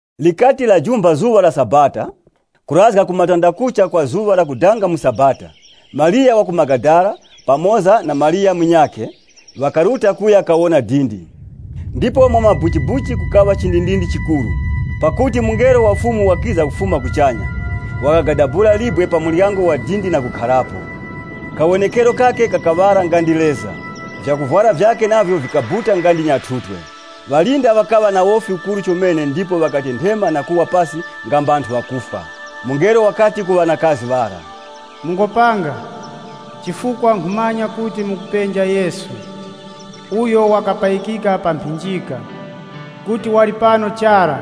Likati lajumpha zuŵa la Sabata kurazga ku matandakucha gha zuŵa lakudanga mu sabata, Mariya wa ku Magadala pamoza na Mariya munyakhe, ŵakaruta kuya kawona dindi. Ndipo mwamabuchibuchi kukaŵa chindindindi chikuru, pakuti mungelo wa Fumu wakiza kufuma kuchanya, wakagadabula libwe pa muryango wa dindi na kukharapo. Kawonekero kakhe kakaŵala nga ndi leza, vyakuvwara vyakhe navyo vikabuta nga ndi nyathutwe. Ŵalinda ŵakaŵa na wofi ukuru chomene ndipo ŵakatenthema na kuwa pasi nga mbanthu ŵakufwa. Mungelo wakati ku ŵanakazi ŵara, “Mungopanga, chifukwa nkhumanya kuti mukupenja Yesu, uyo wakapayikika pa mphinjika. Kuti wali pano chara.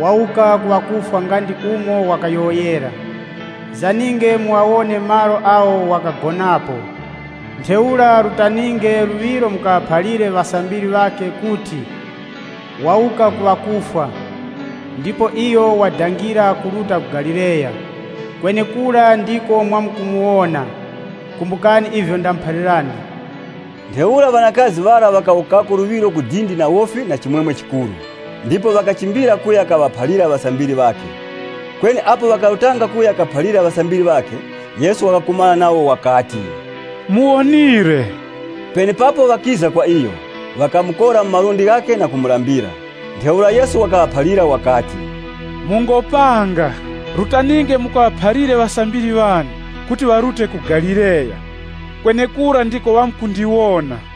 Wawuka ku ŵakufwa nga ndi umo wakayowoyera. Zaninge mughawone malo agho wakagonapo. Ntheura rutaninge luŵiro mukaŵaphalire ŵasambiri ŵakhe kuti, ‘Wawuka ku ŵakufwa, ndipo iyo wadangira kuruta ku Galileya. Kwenekura ndiko mwamkumuwona.’ Kumbukani ivyo ndamuphalirani.” Ntheura ŵanakazi ŵara ŵakawukako luŵiro ku dindi na wofi na chimwemwe chikuru, ndipo ŵakachimbira kuya kaŵaphalira ŵasambiri ŵakhe. Kweni apo ŵakarutanga kuya kaphalira ŵasambiri ŵakhe, Yesu wakakumana nawo, wakati, “Muwonire.” Penepapo ŵakiza kwa iyo, ŵakamukora mu malundi ghakhe na kumulambira. Ntheura Yesu wakaŵaphalira wakati, “Mungopanga, rutaninge mukaŵaphalire ŵasambiri ŵane kuti ŵarute ku Galileya. Kwenekura ndiko ŵamkundiwona.”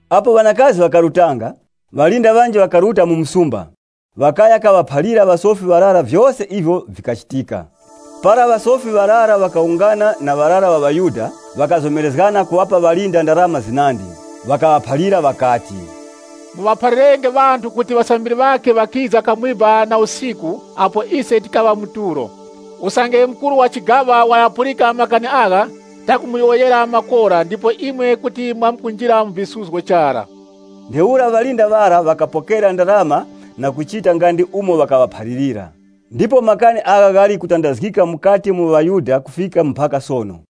Apo ŵanakazi ŵakarutanga, ŵalinda ŵanji ŵakaruta mu msumba, ŵakaya kaŵaphalira ŵasofi ŵarara vyose ivyo vikachitika. Para ŵasofi ŵarara ŵakawungana na ŵarara ŵa ŵaYuda ŵakazomerezgana kuŵapa ŵalinda ndarama zinandi. Ŵakaŵaphalira ŵakati, “Muŵaphalirenge ŵanthu kuti ŵasambiri ŵakhe ŵakiza kamwiba na usiku apo ise tikaŵa mu tulo! Usange mukuru wa chigaŵa ŵaghapulika makani agha, tamkumuyowoyera makora ndipo imwe kuti mwamkunjira mu visuzgo chara.” Ntheura ŵalinda ŵara ŵakapokera ndarama na kuchita nga ndi umo ŵakaŵaphalirira. Ndipo makani agha ghali kutandazgika mukati mu ŵaYuda kufika mpaka sono.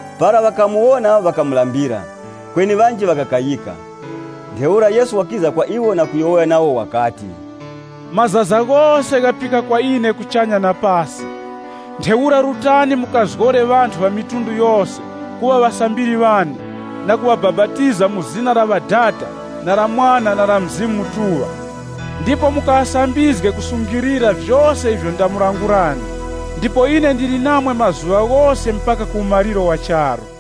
Para ŵakamuwona ŵakamulambira. Kweni ŵanji ŵakakayika. Ntheura Yesu wakiza kwa iwo na kuyowoya nawo wakati, “Mazaza ghose ghapika kwa ine kuchanya na pasi. Ntheura rutani mukazgore ŵamitundu yose kuŵa ŵasambiri ŵane na kuŵabapatiza mu zina la Ŵadada na la Mwana na la Mzimu Mutuŵa. Ndipo mukaŵasambizge kusungilira vyose ivyo ndamulangulirani. Ndipo ine ndili namwe mazuŵa ghose mpaka ku umaliro wa charu.”